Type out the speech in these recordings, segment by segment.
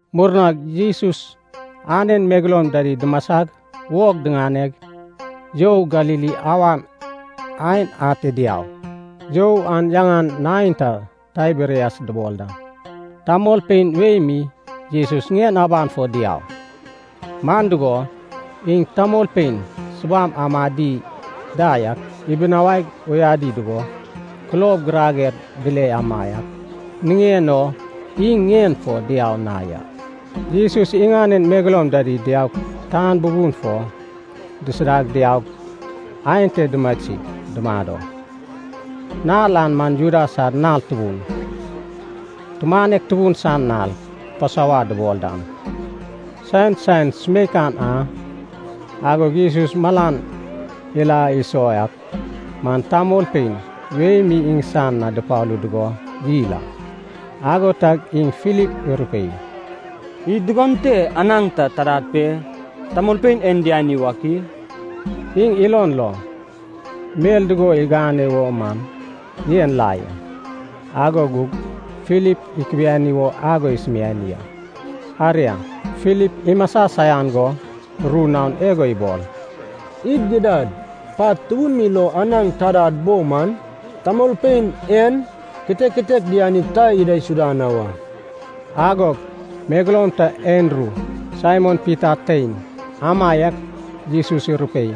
Murnag Jesus anen megeloum dida dumasag wog diŋaneg, you Galili awan aen ate diau. You an yaŋan neinta Taiberias dubol da. Tamolpein wei mi Jesus ŋien aban fo diau, man dugo, iŋ tamolpein subam amadi da yak ibinawaig uyadi dugo kulob girager dile amaiak niŋen o iŋ ŋien fo diau na ya. Jesus iŋanen megeloum dida diaug tan bubun fo disida diaug, ante dumasig dumado. Nal an man Juda sad nal tubun, tumanek tubun san nal Pasova dubol dan san saen sumeikan a. Agog Jesus malan ila iso ak man tamolpein wei mi iŋsan na dupalu dugo yil a. Ago tag iŋ Filip irupei, “Id dugon te anaŋ ta tadad pe, tamolpein en diani wak i?” Iŋ ilon lo, mel dugo igane wo man yen la ya, ago gug Filip ikubiani wo ago isumiani a. Aria, Filip imasa saian go ru naon igo ibol, “Id gidad pat tubun mi lo anaŋ tadad bo man, tamolpein en kitek kitek dianip ta idaisuda na wa.” Agog megeloum ta Andru, Saimon Pita tein, amaiak Jesus irupei,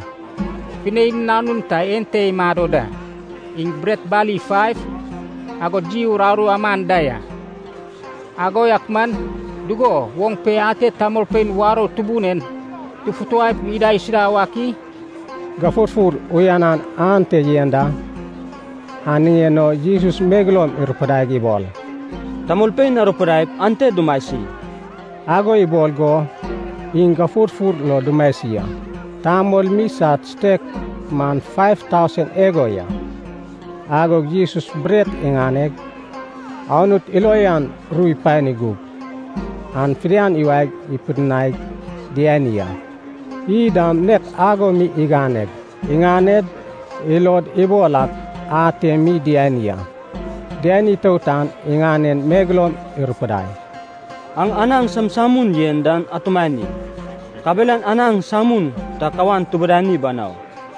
“Pinein nanun ta ente imado da, iŋ bret bali faiv, agod iy uraru aman da ya. Ago yak man, dugo woŋ pe ate tamolpein warou tubun en tufutaip idaisuda wak i?” Gafurfur uyanan ante yen da, an niŋen o Jesus megeloum irupidaig ibol, “Tamolpein arupidaip ante dumasi.” Ago ibol go iŋ gafurfur fo dumasi a. Tamol mi sad sutek man faiv tausen igo ya. Agog Jesus bret iŋaneg, Anut ilo uyan ru ipani gug, an fidian iwae pidinaig diani a. Iy dam nek ago mi iganeg, iŋaned ilod ibol ak ate mi diani a. Diani itout an iŋanen megeloum irupidai, “Aŋ anaŋ samsamun yen dan atumani. Kabelan anaŋ samun ta kawan tibidani banau.”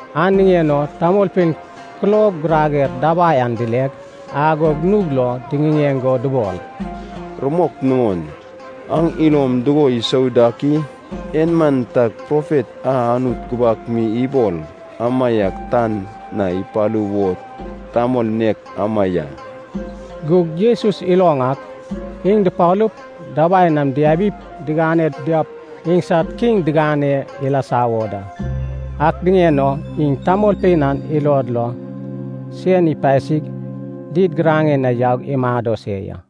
An niŋen o tamolpein kulob girager dabai an dileg, agog nug lo diŋiŋeŋ go dubol, “Rumok nuŋon, aŋ ilom dugo isou dak i? En man tag Profet a Anut gubak mi ibol amaiak tan na ipalu wo tamol nek ema ya.” Gug Jesus iloŋ ak, iŋ dupalup, dabai nam diabip, diŋane diaup iŋsad kiŋ digane ilasa wo da. An niŋen o iŋ tamolpein an ilod lo sen ipasig did giraŋen na yaug imado se ya.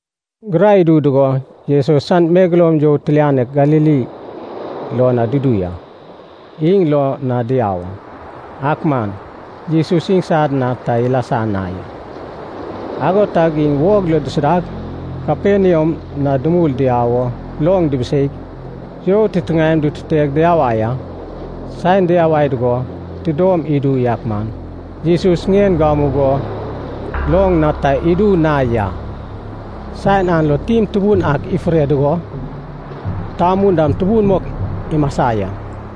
Gurai idu dugo, Jesus san megeloum you tilianek Galili lo na dudu ya. Iŋ loŋ na diau a, ak man Jesus iŋsad na ta ilasa na ya. Ago tag iŋ wog lo dusudag, Kaperniam na dumul diau wo loŋ dibiseig, you titiŋaem dututeg diyawai a. Saen diyawai dugo tidom idu yak man, Jesus nen gamugo loŋ na ta idu na ya. Saen an lo tim tubun ak ifure dugo, tamun dam tubun mok imasa ya.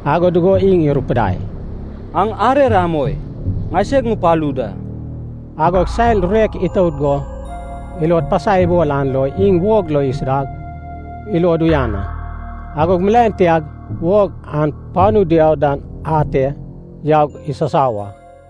Ago dugo iŋ irupidai, “Aŋ arer amoi, ŋaiseg ŋupalu da.” Agog sad rurek itout go ilod pasai ibol an lo iŋ wog lo isuda wo ilod uyan a. Agog milaen tiag wog an panu diau dan ate yaug isasau a.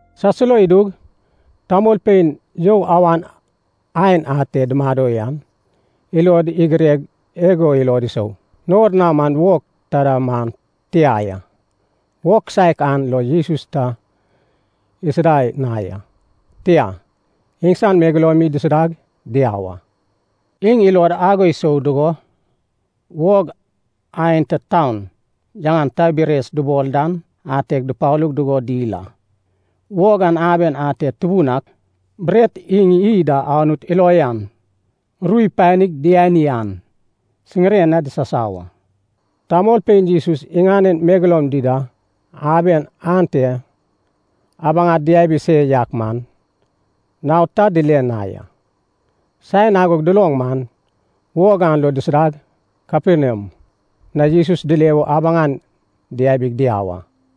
Salso idug tamolpein you awan aen ate dumado yan ilod igireg igo ilod isou: Nor na man wog taida man tia ya. Wog kisaek an lo Jesus ta isuda na ya, tia, iŋsan megeloum mi dusudag diau a. Iŋ ilod ago isou dugo, wog aenta taun yaŋan Taiberias dubol dan ateg dupalu dugo dil a. Wog an aben a ate Tubun ak bret iŋ iy da Anut ilo uyan ru ipanig diani an, siŋiren na disasau a. Tamolpein Jesus iŋanen megeloum dida aben ante abaŋad diabi se yak man, naod ta dile na ya. Saen ago duloŋ man, wog an lo dusudag Kaperniam na Jesus dile wo abaŋan diabig diau a.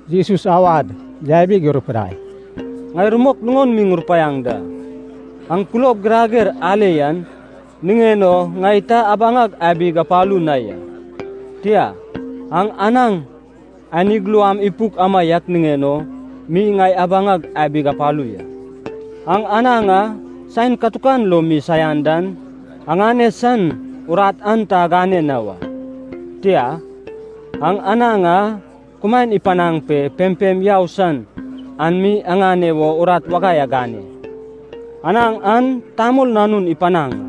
Jesus awad yabig irupudai, “Ŋai rumok nuŋon mi ŋurupaiaŋ da, aŋ kulob girager ale yan niŋen o ŋai ta abaŋag abig apalu na ya. Tia. Aŋ anaŋ anig luam ipuk amaiak niŋen o mi ŋai abaŋag abig apalu ya. Aŋ anaŋ a saen katukan lo mi saian dan aŋane san urat an ta agane na wa. Tia. Aŋ anaŋ a kumaen ipanaŋ pe pempem yau san an mi aŋane wo urat wagai agane. Anaŋ an Tamol Nanun ipanaŋ a.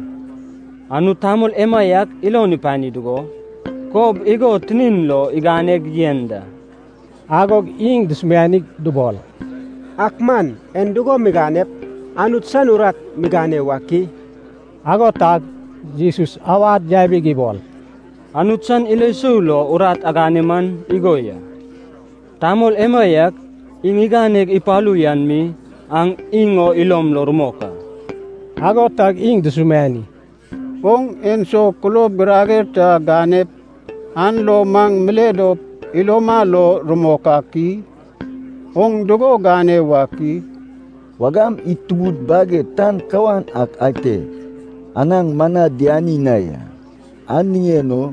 Anut tamol emaiak ilon ipani dugo, kob igo tinin lo iganeg yen da.” Agog iŋ dusumianig dubol, “Ak maŋ en dugo miganep Anut san urat migane wak i?” Ago tag Jesus awad yabig ibol, “Anut san ilo sou lo urat agane man igo ya, tamol emaiak iŋ iganeg ipalu yan mi aŋ iŋ o ilom lo rumok a.” Ago tag iŋ dusumiani, “Oŋ enso kulob girager ta ganep, an lo maŋ mile dop iloma lo rumok ak i? Oŋ dugo gane wak i? Wagam id tubud baged tan kawan ak ate anaŋ mana diani na ya. An niŋen o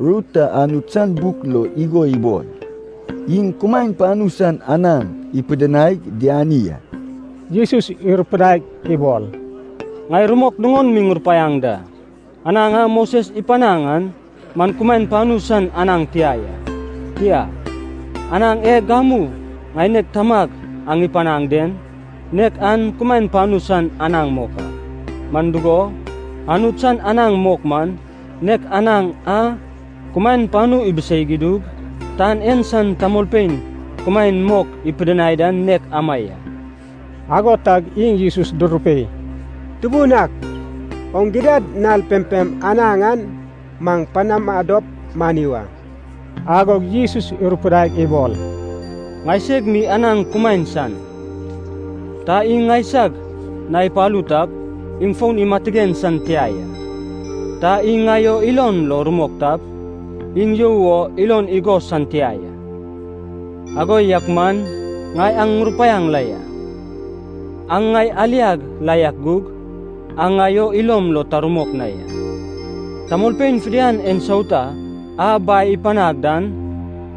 ru ta Anut san buk lo igo ibol, ‘Iŋ kumaen panu san anaŋ ipidinaig diani a.’” Jesus irupudaig ibol, “Ŋai rumok nuŋon mi ŋurupaiaŋ da. Anaŋ a Moses ipanaŋ an man kumaen panu san anaŋ tia ya. Tia. Anaŋ e gamu ŋaineg Tamag aŋ ipanaŋ den, nek an kumaen panu san anaŋ mok a. Man dugo, Anut san anaŋ mok man, nek anaŋ a kumaen panu ibiseig idug, tan en san tamolpein kumaen mok ipidinai dan nek ama ya.” Ago tag iŋ Jesus durupei, “Tubun ak, oŋ gidad nal pempem anaŋ an maŋ panama dop mani wa.” Agog Jesus irupudaig ibol, “Ŋaiseg mi anaŋ kumaen san. Ta iŋ ŋaisag na ipalu tap, iŋ fon imatigen san tia ya. Ta iŋ ŋai o ilon lo rumok tap, iŋ you o ilon igos san tia ya. Ago yak man ŋai aŋ ŋurupaiaŋ la ya, aŋ ŋai aliag la yak gug, aŋ ŋai o ilom lo ta rumok na ya. Tamolpein fidian ensauta a Bai ipanag dan,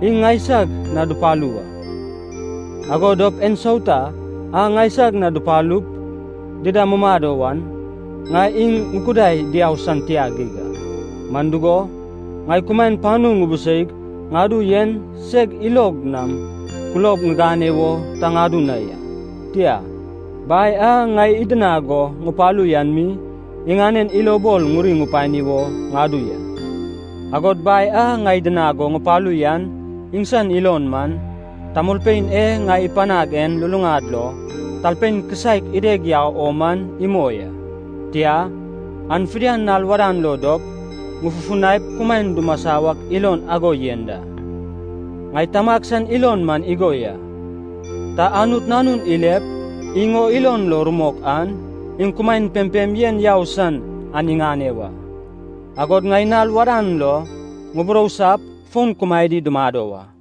iŋ ŋaisag na dupalu wa. Ago dop ensauta a ŋaisag na dupalup dida mumado wan, ŋai iŋ ŋukudai diau san tia geig a. Man dugo, ŋai kumaen panu ŋubuseig ŋadu yen seg ilog nam kulob ŋigane wo ta ŋadu na ya. Tia. Bai a ŋai idinag go ŋupalu yan mi, iŋanen ilobol ŋuri ŋupani wo ŋadu ya. Agod Bai a ŋai idinag go ŋupalu yan iŋsan ilon man, tamolpein e ŋai ipanag en luluŋad lo talpein kisaek ideg yau o man imoi a. Tia, an fidian nal wadan lo dop, ŋufufunaip kumaen dumasa wak ilon ago yen da. Ŋai Tamag san ilon man igo ya. Ta Anut Nanun ilep, iŋ o ilon lo rumok an, iŋ kumaen pempem yen yau san an iŋane wa. Agod ŋai nal wadan lo ŋuburousap, fon kumaedi dumado wa.”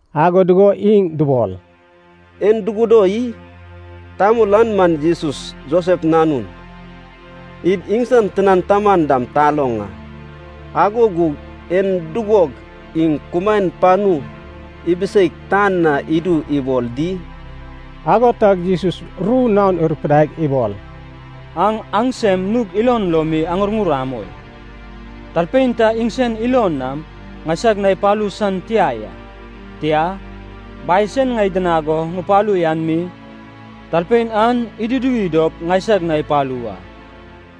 Ago dugo iŋ dubol, “En dugudo i? Tamol an man Jesus, Josef nanun, id iŋsan tinan taman dam taloŋ a. Ago gug en dugog iŋ kumaen panu ibiseig tan na idu ibol di?” Ago tag Jesus ru naon irupudaig ibol, “Aŋ aŋsem nug ilon lo mi aŋurŋur amoi. Talpein ta iŋsen ilon nam ŋaisag na ipalu san tia ya, tia, Bai sen ŋai idinag go ŋupalu yan mi talpein an iduduwi dop ŋaisag na ipalu wa.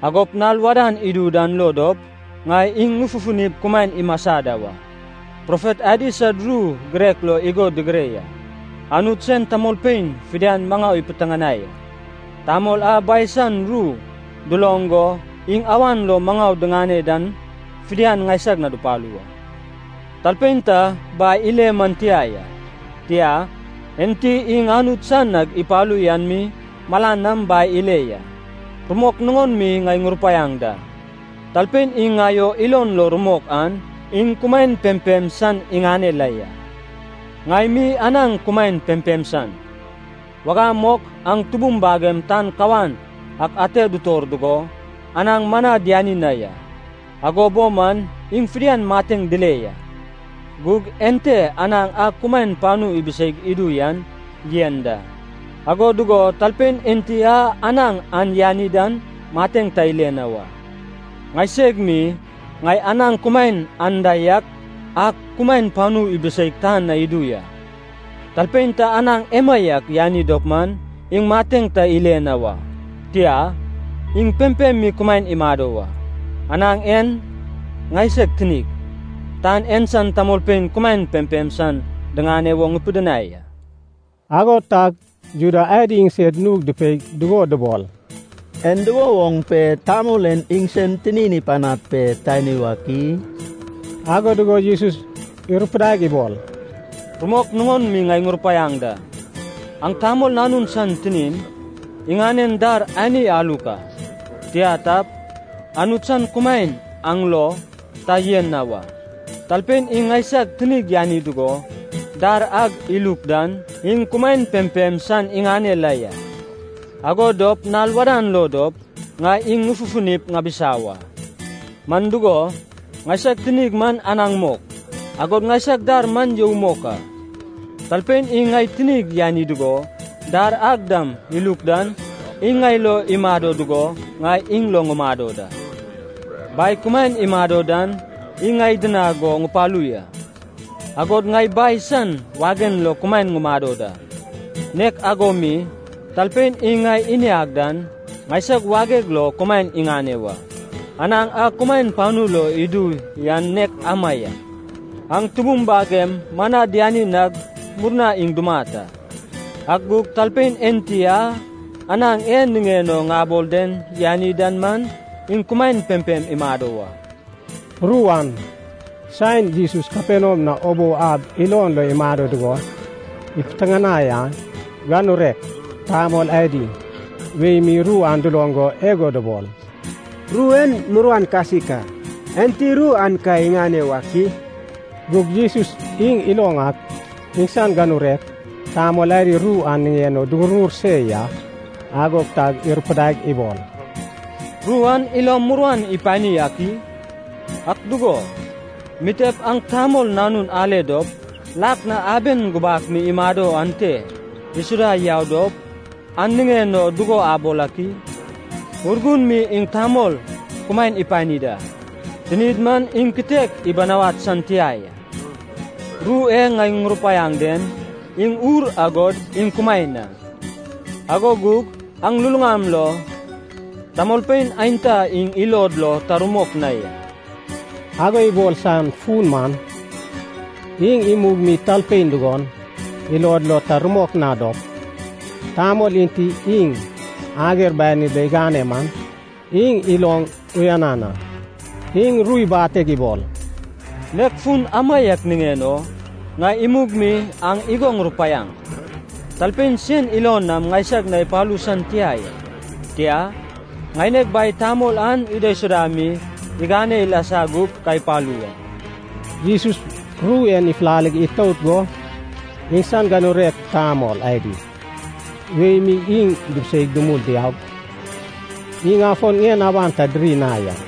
Agop nal wadan idu dan lo dop, ŋai iŋ ŋufufunip kumaen imasa da wa. Profet adi sad ru girek lo igo digire ya, ‘Anut sen tamolpein fidian maŋau ipiteŋanai a.’ Tamol a Bai san ru duloŋ go iŋ awan lo maŋau diŋane dan fidian, ŋaisag na dupalu wa. Talpein ta Bai ile man tia ya. Tia, enti iŋ Anut san nag ipalu yan mi malan nam Bai ile ya. Rumok nuŋon mi ŋai ŋurupaiaŋ da, talpein iŋ ŋai o ilon lo rumok an, iŋ kumaen pempem san iŋane la ya. Ŋai mi anaŋ kumaen pempem san. Wagam mok aŋ tubum bagem tan kawan ak ate dutor dugo, anaŋ mana diani na ya, ago bo man iŋ fidian mateŋ dile ya. Gug ente anaŋ a kumaen panu ibiseig idu yan yen da, ago dugo talpein enti a anaŋ an yani dan mateŋ ta ile na wa. Ŋaiseg mi, ŋai anaŋ kumaen anda yak a kumaen panu ibiseig tan na idu ya. Talpein ta anaŋ emaiak yani dop man, iŋ mateŋ ta ile na wa, tia, iŋ pempem mi kumaen imado wa. Anaŋ en ŋaiseg tinig, tan en san tamolpein kumaen pempem san diŋane wo ŋipidinai a.” Ago tag Juda adi iŋsed nug dupei dugo dubol, “En dugo woŋ pe tamol en iŋsen tinin ipanad pe tani wak i?” Ago dugo Jesus irupudaig ibol, “Rumok nuŋon mi ŋai ŋurupaiaŋ da. Aŋ Tamol Nanun san tinin, iŋanen dar ani aluk a. Tia tap, Anut san kumaen aŋ lo ta yen na wa. Talpein iŋ ŋaisag tinig yani dugo, dar ag iluk dan, iŋ kumaen pempem san iŋane la ya, ago dop nal wadan lo dop, ŋai iŋ ŋufufunip ŋabisa wa. Man dugo, ŋaisag tinig man anaŋ mok, agod ŋaisag dar man you mok a. Talpein iŋ ŋai tinig yani dugo, dar ag dam iluk dan, iŋ ŋai lo imado dugo, ŋai iŋ lo ŋumado da. Bai kumaen imado dan iŋ ŋai idinag go ŋupalu ya, agod ŋai Bai san wagen lo kumaen ŋumado da. Nek ago mi, talpein iŋ ŋai iniag dan, ŋaisag wageg lo kumaen iŋane wa. Anaŋ a kumaen panu log idu yan nek ama ya. Aŋ tubum bagem mana diani nag murna iŋ dumat a. Ak gug talpein enti a, anaŋ e niŋen o ŋabol den yani dan man, iŋ kumaen pempem imado wa.” Ru an, saen Jesus Kaperniam na ubou ab ilon lo imado dugo, ipiteŋanai a. Ganurek tamol adi wei mi ru an duloŋ go igo dubol, “Ru en muruan kasik a, enti ru an ka iŋane wak i?” Gug Jesus iŋ iloŋ ak, iŋsan ganurek tamol adi ru an niŋen o duŋurŋur se ya. Ago tag irupudaig ibol, “Ru an ilom muruan ipani ak i? Ak dugo, mitep aŋ Tamol Nanun ale dop, lak na aben gubak mi imado ante isuda yau dop, an niŋen o dugo abol ak i? Urgun mi iŋ tamol kumaen ipani da, tinid man iŋ kitek ibinawad san tia ya. Ru e ŋai ŋurupaiaŋ den, iŋ ur agod iŋ kumaen a. Ago gug aŋ luluŋam lo tamolpein aenta iŋ ilod lo ta rumok na ya.” Ago ibol san fun man, iŋ imug mi talpein dugon ilod lo ta rumok na dop, tamol enti iŋ ager banid lo igane man, iŋ iloŋ uyanan a. Iŋ ru ibateg ibol, “Nek fun amaiak niŋen o, ŋai imug mi aŋ igo ŋurupaiaŋ; Talpein sen ilon nam ŋaisag na ipalu san tia ya, tia, ŋaineg Bai tamol an idaisuda mi igane ilasa gup ka ipalu wa.” Jesus ru en ifulale itout go, iŋsan ganurek tamol adi wei mi iŋ dibiseig dumul diaug, iŋ afon ŋien aban ta diri na ya.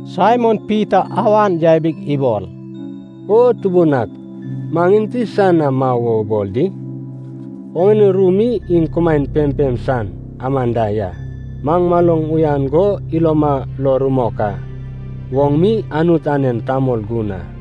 Saimon Pita awan yabig ibol, “O Tubun ak, maŋ enti san na mau wo ubol di? Oŋane ru mi iŋ kumaen pempem san aman da ya. Maŋ maloŋ uyan go iloma lo rumok ak, oŋ mi Anut anen Tamol Gun a.”